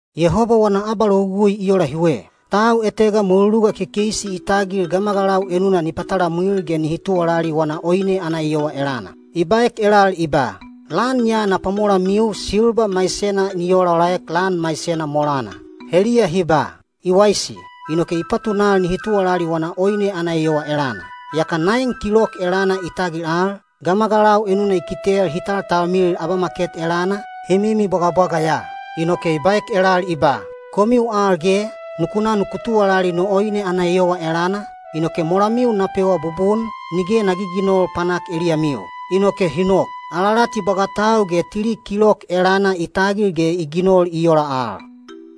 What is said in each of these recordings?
Yehoba wana abalogugui i ola hiwe. Tau etega mweluluga kekeisi i tagil gamagalau enuna ni patalamwil ge nihi tuwalali wana oine ana eyowa elana. I baek elal i ba, “Lan ya na pwamolamiu silba maisena ni olaolaek lan maisena molana.” Heliya hi ba, “I waisi,” inoke i patunal nihi tuwalali wana oine ana eyowa elana. Yaka naen kilok elana i tagil al, gamagalau enuna i kitel hi taltalmilil abamaket elana, hi mimibwagabwaga ya. Inoke i baek elal i ba, “Komiu al ge, nuku na nuku tuwalali no oine ana eyowa elana, inoke molamiu na pewa bubun, nige na giginol panak eliyamiu.” Inoke hi nok. Alalati bwagatau ge tili kilok elana i tagil ge i ginol i ola al.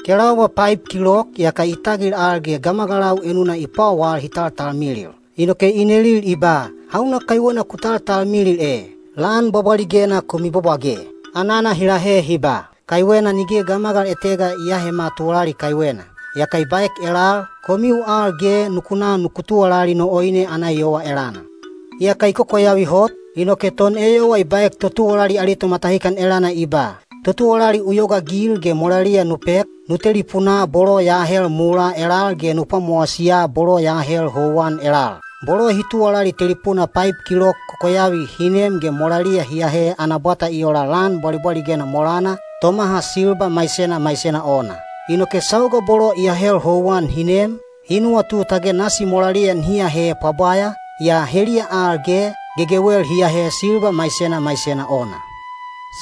Kelaubwa paib kilok yaka i tagil al ge gamagalau enuna i pwawal hi taltalmilil. Inoke i nelil i ba, “Hauna kaiwena ku taltalmilil e, lan bwabwaligena ku mibwabwage?” Anana hi lahe hi ba, “Kaiwena nige gamagal etega i aahema tuwalali kaiwena.” Yaka i baek elal, “Komiu al ge nuku na nuku tuwalali no oine ana eyowa elana.” Iyaka i kokoyavi hot, inoke toneyowa i baek totuwalali ali tomatahikan elana i ba, “Totuwalali u yogaagil ge molaliya nu pek, nu telipunaa bolo ya ahel mulaa elal ge nu pwamowasiya bolo ya ahel houwan elal.” Bolo hi tuwalali telipuna paib kilok kokoyavi hi nem ge molaliya hi ahe ana bwata i ola lan bwabwaligena molana, tomaha silba maisena maisena ona. Inoke sauga bolo i ahel houwan hi nem, hi nuwatu tage nasi molaliya nihi ahe pwabwaya, yaa heliya al ge, gegewel hi ahe silba maisena maisena ona.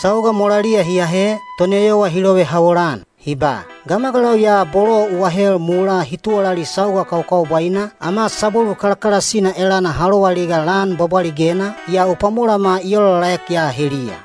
Sauga molaliya hi ahe, toneyowa hi lovehawol-an, hi ba, “Gamagalau ya bolo u ahel mulaa hi tuwalali sauga kakaubwaina, ama sabwelu kalakalasina elana ha loaliga lan bwabwaligena, yaa u pwamolama i olaolaek ya heliya.”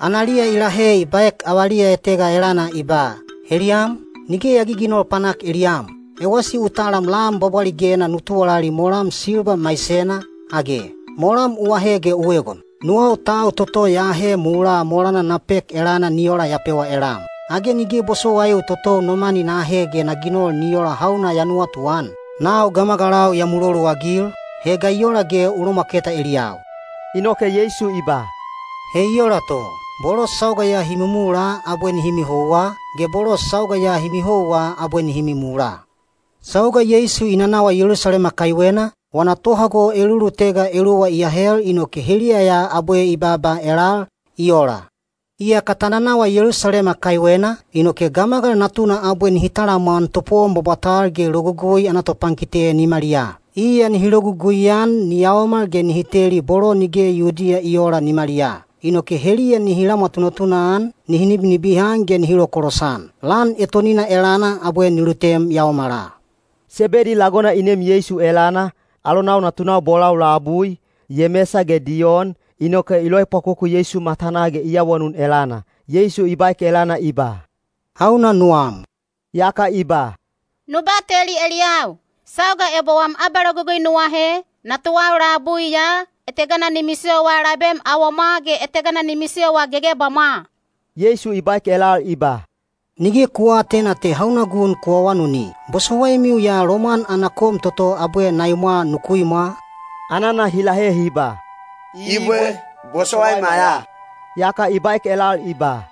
Analiya i lahe i baek avaliya etega elana i ba, “Heliyam, nige ya giginol panak eliyam. Ewasi u talam lan bwabwaligena nu tuwalali molam silba maisena, age? Molam u ahe ge u egon. Nuwau tau toto ya ahe mulaa molana na pek elana ni ola ya pewa elam. Age nige bosowaiu totou no mani na ahe ge na ginol ni ola hauna ya nuwatuan? Nau gamagalau ya muloluagil, he ga i ola ge u lomwaketa eliyau?” Inoke Yeisu i ba, “He i ola to, bolo sauga ya hi mimula abwe nihi mihouwa, ge bolo sauga ya hi mihouwa abwe nihi mimula.” Sauga Yeisu i nanawa Yelusalema kaiwena, wana tohago elulutega eluwa i ahel inoke heliya ya abwe i baaba elal, i ola, “Iyaka ta nanawa Yelusalema kaiwena, inoke Gamagal Natuna abwe nihi talamwan topowon bwabwatal ge Logugui ana topankite nimaliyaa. Iya ana logugui nihi ginol ni yaomal ge nihi teli bolo nige Yudiya i oola nimaliyaa. Inoke heliya nihi lamwa tunatuna-an, nihi nibinibihan ge nihi lokolosan. Lan etonina elana abwe ni lutem yaomala.” Sebedi lagona i nem Yeisu elana, alonau natunau bolau labui, Yemesa ge Diyon, inoke i loepwakoku Yeisu matanaa ge i awanun elana. Yeisu i baek elana i ba, “Hauna nuwam?” Yaka i ba, “Nu bateli eliyau, sauga ebo wam abalogugui nu ahe, natuwau labui ya, etegana ni misiyowa labem awomwa ge etegana ni misiyowa gegebamwa.” Yeisu i baek elal i ba, “Nige ku aatena te hauna gun ku awanuni. Bosowaimiu ya lomwan ana kom toto abwe na imwa nuku imwa?” Anana hi lahe hi ba, “Ibwe, bosowaima ya.” Yaka i baek elal i ba,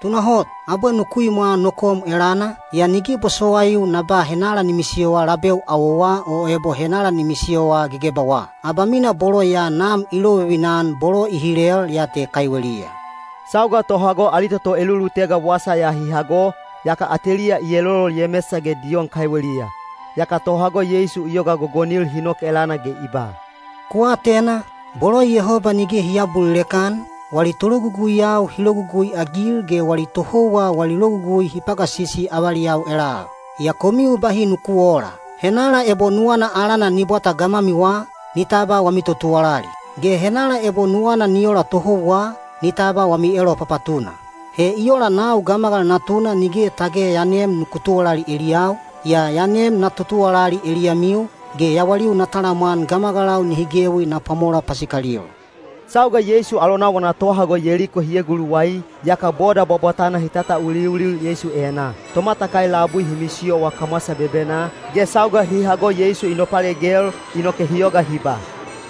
“Tunahot, abwe nuku imwa no kom elana, yaa nige bosowaiu na ba henala ni misiyowa labeu awowa o ebo henala ni misiyowa gegebawa. Abamina bolo ya Nam i lovivina-an bolo i hilel ya te kaiweliya.” Sauga tohago ali toto elulutega wasa ya hi hago, yaka ateliya i elolol Yemesa ge Diyon kaiweliya. Yaka Yeisu tohago i yoga gogonil hi nok elana ge i ba, “Ku atena, bolo Yehoba nige hi aabulilek-an, wali tologuguiyau hi logugui-agil ge wali tohouwa wali logugui hi pagasisi avaliyau elal. Yaa komiu bahi nuku oola. Henala ebo nuwana alana ni bwata gamwamiwa, ni tabwa wami totuwalali. Ge henala ebo nuwana ni ola tohouwa, ni tabwa wami elopapatuna. He i ola nau Gamagal Natuna nige tage ya nem nuku tuwalali eliyau, yaa ya nem na totuwalali eliyamiu, ge yawaliu na talamwan gamagalau nihi gewi na pwamola pasikalil.” Sauga Yeisu alonau wana tohago Yeliko hi eguluwai, yaka boda bwabwatana hi tatauliulil Yeisu enaa. Tomatakai labui hi misiyowa kamwasa bebenaa, ge sauga hi hago Yeisu i nopalegel, inoke hi yoga hi ba,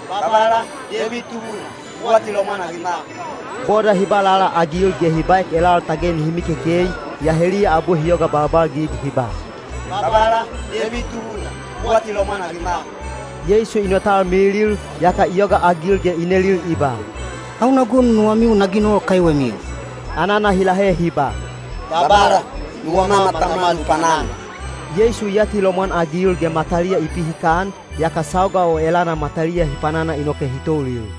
“Babala, Deibid Tubuna, u atilomwan-agima.” Boda hi ba lalaagil ge hi baek elal tage nihi mikekei, yaa heliya abwe hi yoga balbalgig hi ba, “Babala, Deibid Tubuna, u atilomwan-agima.” Yeisu i notalmilil, yaka i yogaagil ge i nelil i ba, “Hauna gun nuwamiu na ginol kaiwemiu?” Anana hi lahe hi ba, “Babala, nuwama matama nu panana.” Yeisu i atilomwan-agil ge mataliya i pihikan, yaka sauga o elana mataliya hi panana inoke hi toulil.